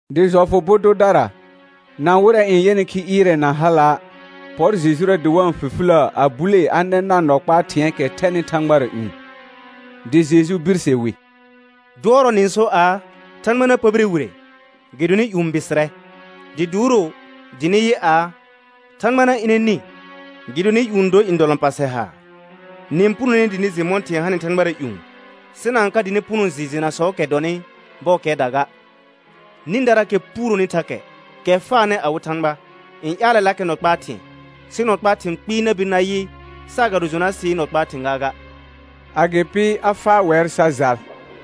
Dɩ jɔfʋ bʋ dʋdara, na wɩrɛ n yɛnɩ khi ɩɩrɛ na hala', pɔr Jejura dɩ wa-n fifiləə a bulee a nɛ nar nɔ kpaa thɩ̃ɛɛkɛ thɛnɩ thãgbara ƴũ. Dɩ Jeju birse wi: Dʋɔrɔ nɩ-n sor aa, thãgba na pəbire wire, gɩdonɩ ƴũ bɩsɩrɛ. Dɩ duuro dɩ nɩ yɩ aa, thãgba na ɩnɛ nĩ, gɩdonɩ ƴũ dor ndɔlɔ̃pa sɛ haar. Nɩ-n punone dɩ nɩ jɩ mɔ̃ thɩ̃ɛ n hanɩ thãgbara ƴũ, sɩ na-n ka dɩ nɩ puno jɩ jenasɔɔkɛ dɔnɩ bɔɔkɛɛda ga. Nĩdaraakɛ puuroni thakɛ, kɛ faanɩ awɩ Thãgba, n ƴaalɛlakɛ nɔ kpaa thɩ̃ɛ, sɩ nɔ kpaa thɩ̃ kpɩɩ na bir na yɩ saagado Jonasɩɩ nɔ kpaa thɩ̃ gaaga. Agɩpɩ a faa wɛr sa jal.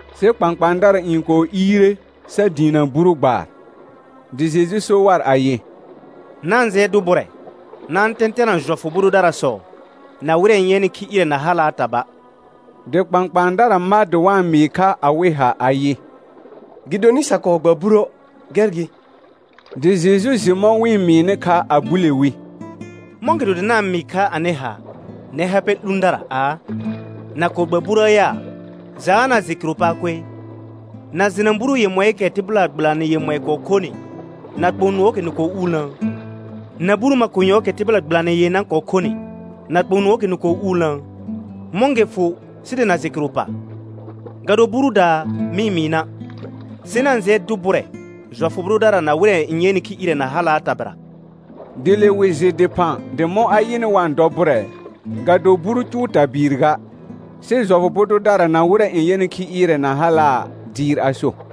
Sɩ kpãkpãadara n kɔɔ iire sa diinə buru gbaar. Dɩ Jeju so war ayɩ: Na-n jɩɛ dʋ bʋrɛ na-n tɛ̃tɛna jɔfʋ bʋ dʋdarasɔ na wɩrɛ n yɛnɩ khi ɩɩrɛ na halaa taba'. Dɩ kpãkpãadara ma dɩ wa-n mɩɩ kha awɩ ha ayɩ: Gɩdonɩ sa kɔɔ gba buruə', gɛr gɩ. Dɩ Jeju jɩ mɔ̃ wɩ-n mɩɩnɩ kha a bule wi: Mɔ̃gɩdo dɩ na-n mɩɩ kha anɩ ha, nɛr ha pɛ 'lũdara aa, na kɔɔ gba buruə yaa? Jaa na jɩ kɩrʋ paa koe? Na jɩna buru yemɔɩɩkɛ tɩbɩla gbɩlanɩ yemɔɩ kɔɔ khonɩ na kpõ nʋɔɔkɛ nɩ kɔɔ uulnəə? Na buru makonyɔɔkɛ tɩbɩla gbɩlanɩ yenã kɔɔ khonɩ na kpõ nʋɔɔkɛ nɩ kɔɔ uulnəə? Mɔ̃ gɩ fʋ sɩ dɩ na jɩ kɩrʋ pa? Ga do burudaa mɩ mɩɩ na'. Sɩ na-n jɩɛ dʋ bʋrɛ jɔfʋ bʋ dʋdara na wɩrɛ n yɛnɩ khi ɩɩrɛ na halaa tabɩra. Dɩ le wɩ jɩ dɩphã dɩ mɔ̃ a yɩnɩ wa-n dɔ bʋrɛ, ga do buru cʋʋ tabɩɩr ga, sɩ jɔfʋ bʋ dʋdara na wɩrɛ n yɛnɩ khi ɩɩrɛ na halaa dɩɩr a so.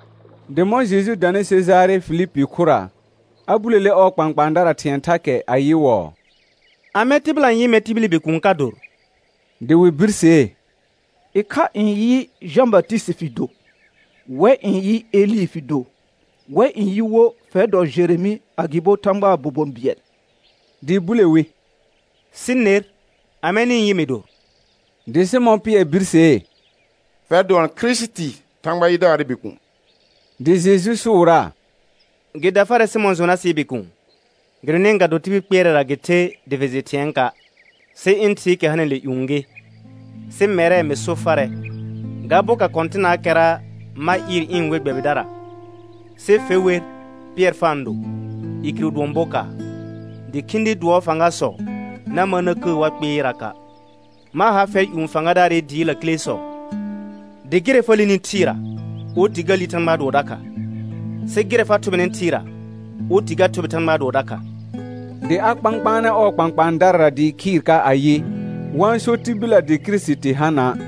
Dɩ mɔ̃ Jeju danɩ Sejare Fihpi khʋra, a bulele ɔɔ kpãkpãadara thɩ̃ɛ thakɛ ayɩwɔɔ: Amɛ tɩbɩla n yɩ mɛr tibili Bikuun ka dor? Dɩ wɩ birsee: Ɩkha n yɩ, Jã Batɩsɩtɩ fɩ do. Wɛ n yɩ, Elɩ fɩ do. Wɛ n yɩ wo, fɛr dɔ Jeremɩ agɩbo Thãgbaa bobon bɩɛl. Dɩ bule wi: Sɩ ner, amɛ nɩ-n yɩ mɩ dor? Dɩ Sɩmɔ̃ Pɩɛr birsee: Fɛr dʋɔn Kirisiti Thãgba yidaarɩ Bikuun. Dɩ Jeju sʋʋraa: Gɩ da farɛ Sɩmɔ̃ Jonasɩɩ bikuun, gɩdonɩ ga do tibil kpɩɛrɛra gɩ the dɩ fɩ jɩ thɩ̃ɛɛka', sɩ ɩ̃ Thɩɩkɛ hanɩle ƴũ gɩ. Sɩ mɛrɛ, mɩ so farɛ: Ga boka kɔ̃tɩnaakɛra ma ɩɩr ɩ̃ we gbɛbɩdara, sɩ fe wer Pɩɛr fa-n do (i kɩrʋ dʋɔn bokaar), dɩ khĩdi dʋɔɔ fãgasɔ na mar na kəə war kpɩɩraka'. Ma ha fɛr ƴũ fãgadaarɩ dɩɩ lakilesɔ, dɩ gɩrɛ fa lini thɩɩra, oti ga li Thãgbaa dʋɔ dakha, sɩ gɩrɛ fa thʋbɩnɩ thɩɩra, oti ga thʋbɩ Thãgbaa dʋɔ dakha. Dɩ a kpãkpaanɛ ɔɔ kpãkpãadarara dɩɩ khɩɩr ka ayɩ, wa-n so tibillə dɩ Kirisiti ha na'.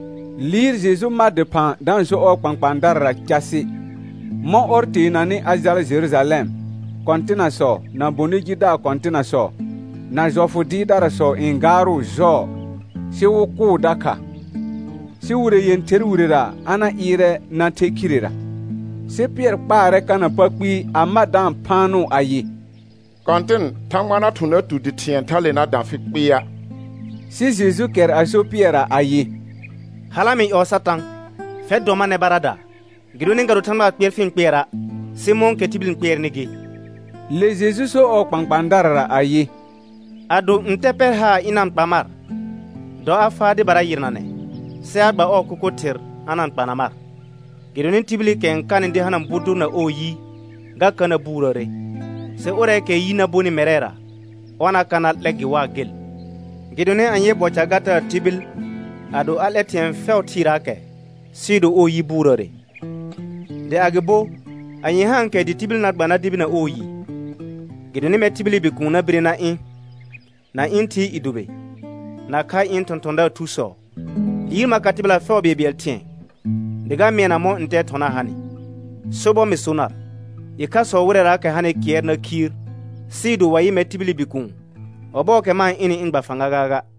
Liir Jeju ma dɩphã da-n so ɔɔ kpãkpãadarara casɩ, mɔ̃ ɔr teenanɩ a jala Jerujalɛm, kɔ̃tɩnasɔ, na bonɩ jidaar kɔ̃tɩnasɔ, na jɔfʋ dɩɩrdarasɔ n gaarʋʋ jɔɔ, sɩ wɩ kʋʋ dakha, sɩ wire yẽther wirera a na ɩɩrɛ na the khirera. Sɩ Pɩɛr kpaarɛ kana pa kpɩɩ, a ma da-n phaanʋʋ ayɩ: Kɔ̃tɩn, Thãgba na thʋ̃ na tu dɩ thɩ̃ɛ tha.e na dã fɩ kpɩɩa'. Sɩ Jeju kɛr a so Pɩɛrra ayɩ: Hala mɩ ƴɔɔ Satã. Fɛr dɔ mar nɛ baradaa, gɩdonɩ ga do Thãgbaa kpɩɛr fɩ-n kpɩɛra', sɩ mɔ̃kɛ tibil n kpɩɛrnɩ gɩ. Le Jeju so ɔɔ kpãkpãadarara ayɩ: Ado ntɛ pɛr haar ɩna-n kpa mar, dɔ a faa dɩbara yɩrnanɛ, sɩ a gba ɔɔ kʋkʋ thɩr a na-n kpana mar. Gɩdonɩ tibilikɛ n kanɩ dɩ hana bʋ dʋr na ɔɔ yi, ga ka na buurəəre. Sɩ ʋrɛɛkɛɛ yi na bonɩ mɛrɛra, ɔr na ka na 'lɛ gɩ waa gel. Gɩdonɩ anyee bɔ ca ga taa tibil, ado a 'lɛ thɩ̃ɛ fɛʋ thɩɩraakɛ, sɩɩ do ɔɔ yi buurəəre? Dɩ agɩbo anye haankɛ dɩ tibi na gba na debina ɔɔ yi? Gɩdonɩ mɛr tibili Bikuun na bire na ɩ̃ na ɩ̃ Thɩɩ i dʋbɩ nakha ɩ̃ thɔ̃thɔ̃daar thusɔ. Liir ma ka tɩbɩla fɛʋ bɩɛlbɩɛl thɩ̃ɛ dɩ ga mɩɛna mɔ̃ ntɛɛ thɔna hanɩ. Sobɔr mɩ so nar, ɩkhasɔ wɩrɛraakɛ hanɩ kɩɛr na khiir, sɩɩ do wa yɩ mɛr tibili Bikuun ɔbɔɔkɛ ma-n ɩnɩ ɩ̃ gba fãga gaaga.